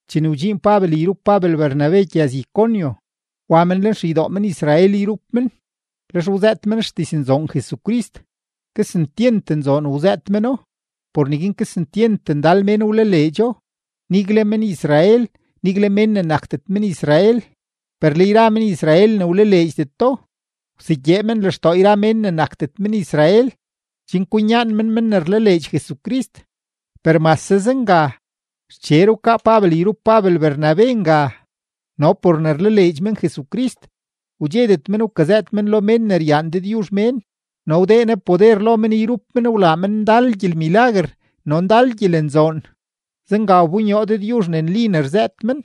Chene wdxiin Pabel yrup Pabel Bernabe gyëz-Iconio, wa men lenxeydoo men-Israel yrup men, lex wzëët men xdiznzoon Jesucrist, kesentyent nzoon wzëët meno; por neguin kesentyent ndal mén wlaleedxo, nigle men-Israel, nigle mén ne nakdet men-Israel. Per le yra men-Israel ne wlaleedxdeto, wsegyee men lextoo yra mén ne nakdet men-Israel, chen kwinyaan men men ne rlaleedx Jesucrist. Per mase zenga, xcher wkaa Pabel yrup Pabel Bernabe nga, no por ne rlaleedx men Jesucrist, wdxedet men wkazëët men lo mén ne ryaan Dëdyuzh mén, no wdee Ne poder lo men yrup men wlaa men ndal gyelmilaguer no ndal gyelenzoon; zenga wbonyoo Dëdyuzh ne nli ne rzëët men.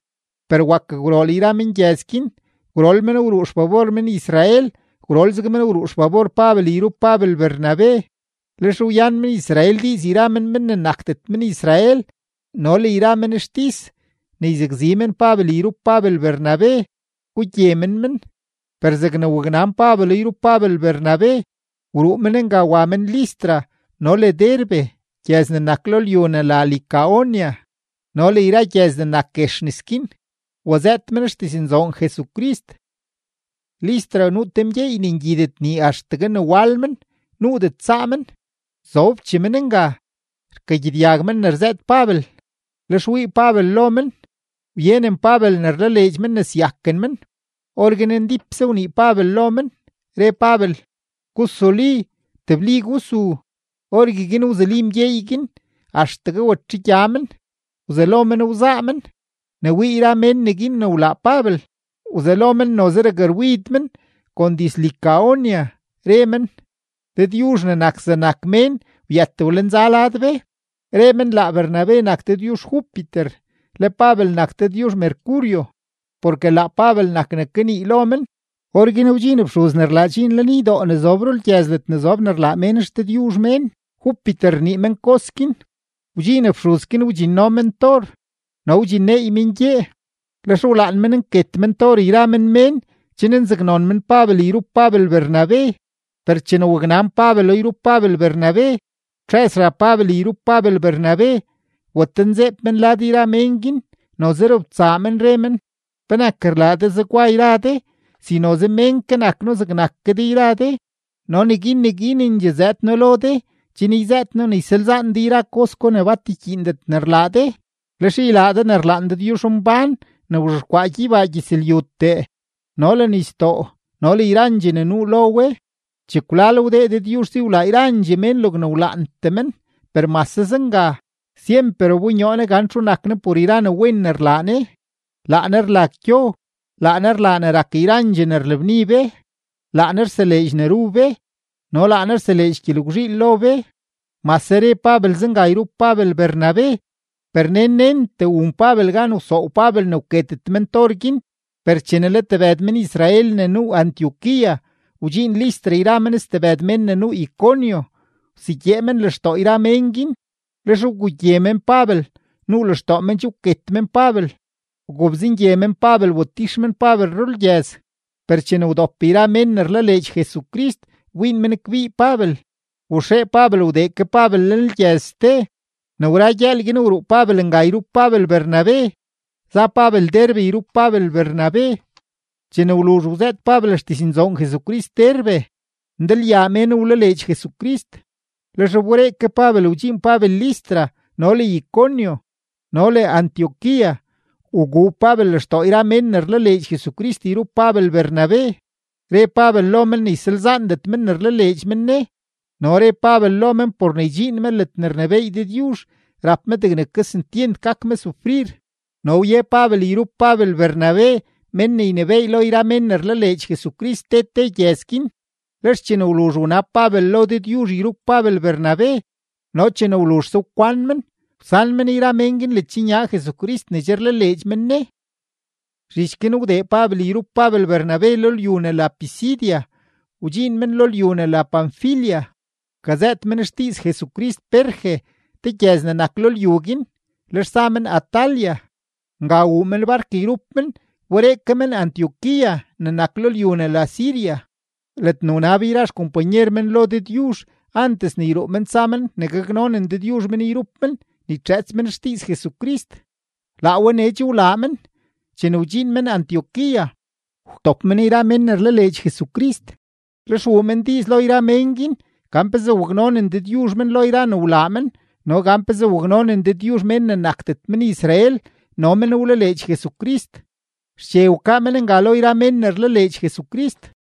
Per wakgwrool yra mengyëz guin, gwrool men wruu xfabor men-Israel, gwrolzeg men wruu xfabor Pabel yrup Pabel Bernabe. Lex wyan men-Israel diiz yra men mén ne nakdet men-Israel no le yra men xtis ne yzakzi men Pabel yrup Pabel Bernabe, gugye men men. Per zegne waknan Pabelo yrup Pabel Bernabe, wruu men nga wa men Listra no le Derbe gyëz ne nak lo lyu ne la Licaonia no le yra gyëz ne nak guex nes guin, wazëët men xdiznzoon Jesucrist. Listra nuu te mgyeey ne ngyidet nii axtegue ne wal men, nuudet saa men; zobchee men nga, rkagyedyag men ne rzëët Pabel, lex wii Pabel lo men, wyenen Pabel ne rlaleedx men ne syaken men. Orguin ndípse wnii Pabel lo men, re Pabel: ―Gusuli, tebli gusu. Orgueguin wzuli mgyeey guin axtegue watxegya men, wzelo men wzaa men. Ne wii yra mén neguin ne wlaa Pabel, wzelo men noze rakrwid men kon diz-Licaonia, re men: ―¡Dëdyuzh ne nak zegnak mén wyët wlenza lad be! Re men, laa Bernabe nak dëdyuzh Júpiter, le Pabel nak dëdyuzh Mercurio, porke laa Pabel nak ne kanii lo men. Orguin wdxiin fxuz ne rlaa dxiin lenydoo ne zob rulgyëz ledne zob ne rlaa mén xdëdyuzh mén; Júpiter rnii men kos guin. Wdxiin fxuz guin wdxinno men tor no wdxinneey men gyee; lex wlaan men nket men tor yra men mén chen nzaknon men Pabel yrup Pabel Bernabe. Per chene waknan Pabelo yrup Pabel Bernabe, wtxëz xab Pabel yrup Pabel Bernabe, watenzeeb men lad yra mén guin, noze robtsaa men, re men: ―¿Penak rlaa de zegwa yra de si noze mén ke nak noo zegnak ke de yra de? No neguin neguinendxee zëëd noo lo de chen yzëët noo ne ysalzaan de yra kos gwa ne bat rkyiindet ne rlaa de, lex ylaa de ne rlaan Dëdyuzhmbán ne wzhexkwaa gyeybaa gyëzlyutee no le nisdoo no le yrandxee ne nuu lo we. Chekwlal wdee Dëdyuzh si wlaa yrandxee mén logne wlaantee men. Per mase zenga, syemper wbonyoo Ne gan txu nak Ne por yra ne wen ne rlaa Ne. Laa Ne rlag gyo, laa Ne rlaa ne rak yrandxee ne rlabni be, laa Ne rseleedx ne ru be no laa Ne rseleedx gyelgwzhiil lo be. Mase re Pabel zenga yrup Pabel Bernabe, per nen nentee wun Pabel gan wsoow Pabel ne wketet men tor guin. Per chene le tebëd men-Israel ne nuu Antioquía wdxiin Listra yra men stebëd mén ne nuu Iconio, wsegyee men lextoo yra mén guin. Lex wgugye men Pabel; nuu lextoo men che wket men Pabel, wgobzengye men Pabel watix men Pabel rulgyëz. Per chene wdop yra mén ne rlaleedx Jesucrist wbiin men kbii Pabel, waxee Pabel wdee ke Pabel lenlgyëz ste. Ne wra gyëël guin, wruu Pabel nga yrup Pabel Bernabe, za Pabel Derbe yrup Pabel Bernabe. Chene wluzh wzëët Pabel xdiznzoon Jesucrist Derbe, ndalyaa mén wlaleedx Jesucrist. Lex wberee ke Pabel wdxiin Pabel Listra no le Iconio no le Antioquía, wguu Pabel lextoo yra mén ne rlaleedx Jesucrist yrup Pabel Bernabe, re Pabel lo men ne ysalzaandet men ne rlaleedx men Ne, no re Pabel lo men por ne ydxiin me ledne rnebééy Dëdyuzh, rap me degne kesentyent gak me sufrir. No wye Pabel yrup Pabel Bernabe mén ne ynebééy lo yra mén ne rlaleedx Jesucrist te te gyëz guin, lex chene wluzh wnab Pabel lo Dëdyuzh yrup Pabel Bernabe no chene wluzhse wkwan men, wsan men yra mén guin ledxnya Jesucrist ne che rlaleedx men Ne. Zhich guin wdee Pabel yrup Pabel Bernabe lo lyu ne la Pisidia, wdxiin men lo lyu ne la Panfilia. Wkazëët men xdiiz Jesucrist Perge te gyëz ne nak lo lyu guin, lex za men Atalia. Nga wuu men bark yrup men wberee ke men Antioquía ne nak lo lyu ne la Siria, ledne wnab yra xkompanyer men lo Dëdyuzh antes ne yruu men tsa men ne gaknonen Dëdyuzh men yrup men ne ytxëëts men xdiiz Jesucrist. Laa we nee che wlaa men. Chene wdxiin men Antioquía, wtop men yra mén ne rlaleedx Jesucrist, lex wuu men diiz lo yra mén guin gan pezee waknonen Dëdyuzh men lo yra ne wlaa men no gan pezee waknonen Dëdyuzh mén ne nakdet men-Israel no men wlaleedx Jesucrist. Xche wkaa men nga lo yra mén ne rlaleedx Jesucrist.